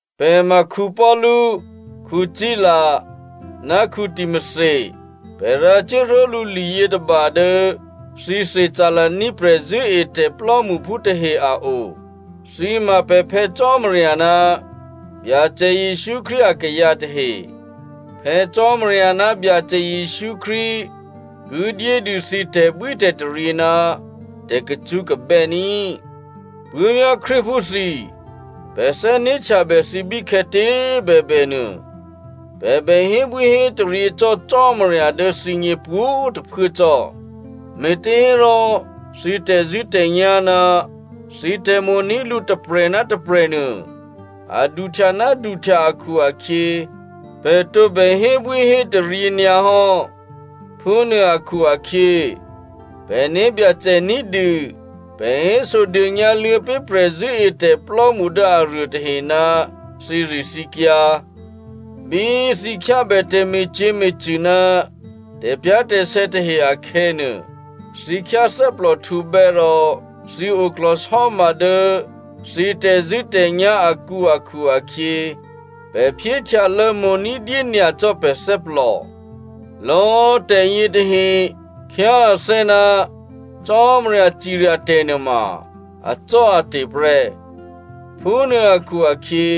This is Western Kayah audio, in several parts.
Pè̤ ma Paulu, Sila, ná Timothy. Pè̤ rǎcuố ró̤lǔ liyětôba dố thǐ Thessalonia prè̤zṳ̂́etè̤ plò́mṳphú tahe a o. Thǐ ma pè̤ Phè̌ Cò́marya ná Byacè Jesǔ Krístu akayǎ tahe. Phè̌ Cò́marya ná Byacè Jesǔ Krístu ki dyédû thǐ tè̤bwítè̤taryě ná tè̤kacṳ́kabè́ ní꤮. Puố̤vyá̤ Krístuphú thǐ꤮, pè̤ thè́né̤htyabè thǐ bíkhè̌tě꤮ bèbè nuô, pè̤ bè hébwíhétaryě cò́ Cò́marya dố thǐgně pwǒ̤꤮ tôphuố cò́, me̤těhérò thǐ tè̤zṳ̂́tè̤nyá̤ ná thǐ tè̤mo̤ní̤ lǔ tôprè̤ ná tôprè̤ nuô, a duhtya ná duhtya akhu-akhyě, pè̤ tǒbè hébwíhétaryě nyǎ hò́. Phúnuô akhu-akhyě, pè̤ né̤byacè ní̤dû pè̤ hésodônyǎ luô̌pé̤ prè̤zṳ̂́etè̤plò́mṳ dố aruô tahe ná thǐrithǐkyǎ. Bí thǐ khyábè tè̤me̤cyě̤me̤cṳ̂ ná tè̤pyá̤tè̤sè̌ tahe akhè̌nuô, thǐ khyáthè́plòhtǔbè́ rò thǐ oklò̤sò́ma dố thǐ tè̤zṳ̂́tè̤nyá̤ akǔ akhu-akhyě, pè̤ phyéhtyalô̌ mo̤ ní̤dyé nyacò́ pè̤ thè́plò. Lò̌꤮ tè̤yětahe khyá athè́ ná Cò́marya cirya tè̤ nuôma acò́ate̤ prè́. Phúnuô akhu-akhyě,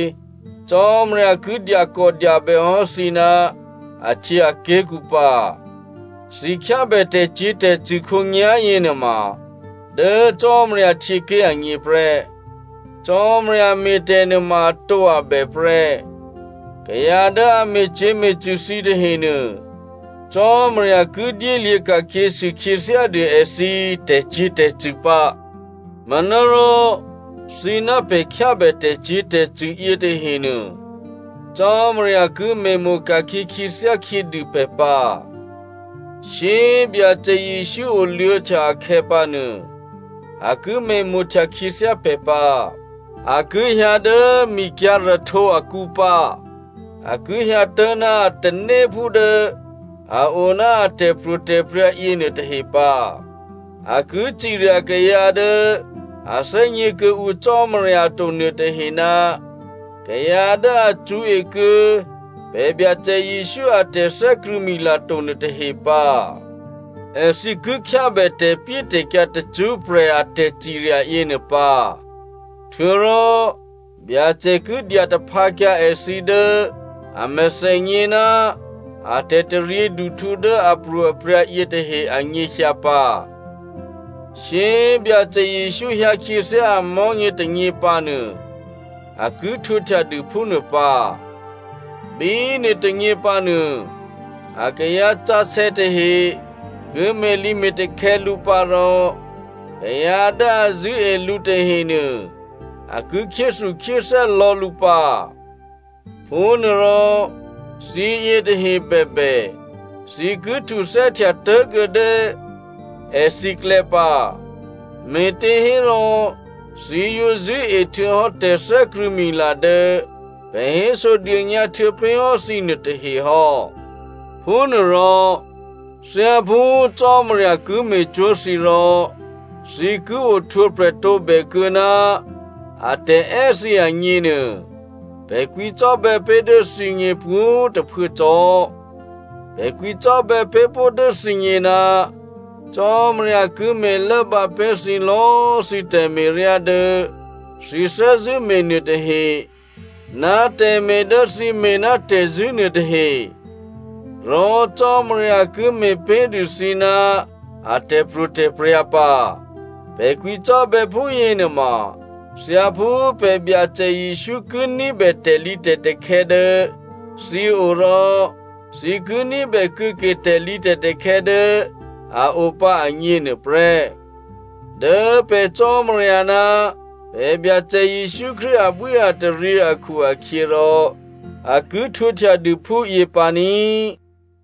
Cò́marya ki dyakòdyabè hò́ thǐ ná ahtyěaké̤kǔ pǎ. Thǐ khyábè tè̤cyě̤tè̤cṳ̂ khǒnyá̤yě nuôma dố Cò́marya htyěké̤ agně prè́. Cò́marya me̤ tè̤ nuôma atǒabè prè́. Kayǎ dố a me̤cyě̤me̤cṳ̂ thǐ tahenuô, Cò́marya ki dyélyě̤ ka̤khyěsû khyěthyádû èthǐ tè̤cyě̤tè̤cṳ̂ pǎ. Manárò thǐ ná pè̤ khyábè tè̤cyě̤tè̤cṳ̂ yětahenuô, Cò́marya ki me̤mo̤ ka̤khyě khyěthyá khyědû pè̤ pǎ. Shyé꤮ Byacè Jesǔ oluô̌htya akhè̌pǎnuô, a ki me̤mo̤htya khyěthyá pè̤ pǎ. A ki hyǎ dố mikyǎ̤rahtǒ akǔ pǎ. A ki hyǎtố̤ ná a tanéphú dố a oná a tè̤pro̤tè̤prya̤ yěnuô tahe pǎ. A ki cirya kayǎ dố a thè́gně kuô̌ǔ Cò́marya to nuôtahe ná kayǎ dố a cṳ̌e kuô̌ pè̤ Byacè Jesǔ a tè̤thè́krṳ̂̌mila to nuôtahe pǎ. Èthǐ ki khyábè tè̤pyétè̤kyǎ tacṳ́prè̤ a tè̤cirya yěnuô pǎ. Htuô̌rò Byacè ki dyataphǎkyǎ èthǐ dố a mèthènyě ná a tè̤taryěduhtǔ dố apro̤aprya̤ yětahe anyěhyǎ pǎ. Shyé꤮ Byacè Jesǔ hyǎkhyěthyá amò̤́nyě tônyě pǎnuô, a ki htwǒhtya dû phúnuô pǎ. Bí nuôtônyě pǎnuô, akayǎ sǎsè̌ tahe ki me̤lǐme̤takhè̌ lǔ pǎ rò kayǎ dố a zṳ̂́e lǔ tahenuô, a ki khyéthukhyéthè́ lò̌ lǔ pǎ. Phúnuôrò thǐyě tahehe bèbè, thǐ ki htuthè́htya tố̤kuô̌ dố èthǐklè̌ pǎ, me̤těhérò thǐ yǒ zṳ̂́e htuô̌hò́ tè̤thè́krṳ̂̌mila dố pè̤ hésodônyǎ htuô̌pé̤ hò́ thǐ nuôtahe hò́. Phúnuôrò thyáphú Cò́marya ki me̤cwó̤ thǐ rò thǐ ki ohtwǒprè̤ tǒbèkuô̌ ná atè̤è́ thǐ agněnuô, pè̤ kwǐcò́bè̌ pé̤ dố thǐgně pwǒ̤꤮ tôphuố cò́. Pè̤ kwǐcò́bè̌ pé̤ pó̤ dố thǐgně ná Cò́marya ki me̤lốbǎ pé̤ thǐ lò̌꤮ thǐ tè̤me̤ryá dố thǐ thè́zṳ̂́me̤ nuôtahe, ná tè̤me̤ dố thǐ me̤ ná tè̤zṳ̂́ nuôtahe. Rò Cò́marya ki me̤pé̤dû thǐ ná a tè̤pro̤tè̤prya̤ pǎ. Pè̤ kwǐcò́bè̌ phúyě nuôma thyáphú pè̤ Byacè Jesǔ ki ní̤bè tè̤lǐtè̤takhè̌ dố thǐ o rò thǐ ki ní̤bè kuô̌ke tè̤lǐtè̤takhè̌ dố a o pǎ agně nuôprè́. Dố pè̤ Cò́marya ná pè̤ Byacè Jesǔ Krístu abwíataryě akhu-akhyěrò a ki htwǒhtya dû phúyě pǎ ní꤮.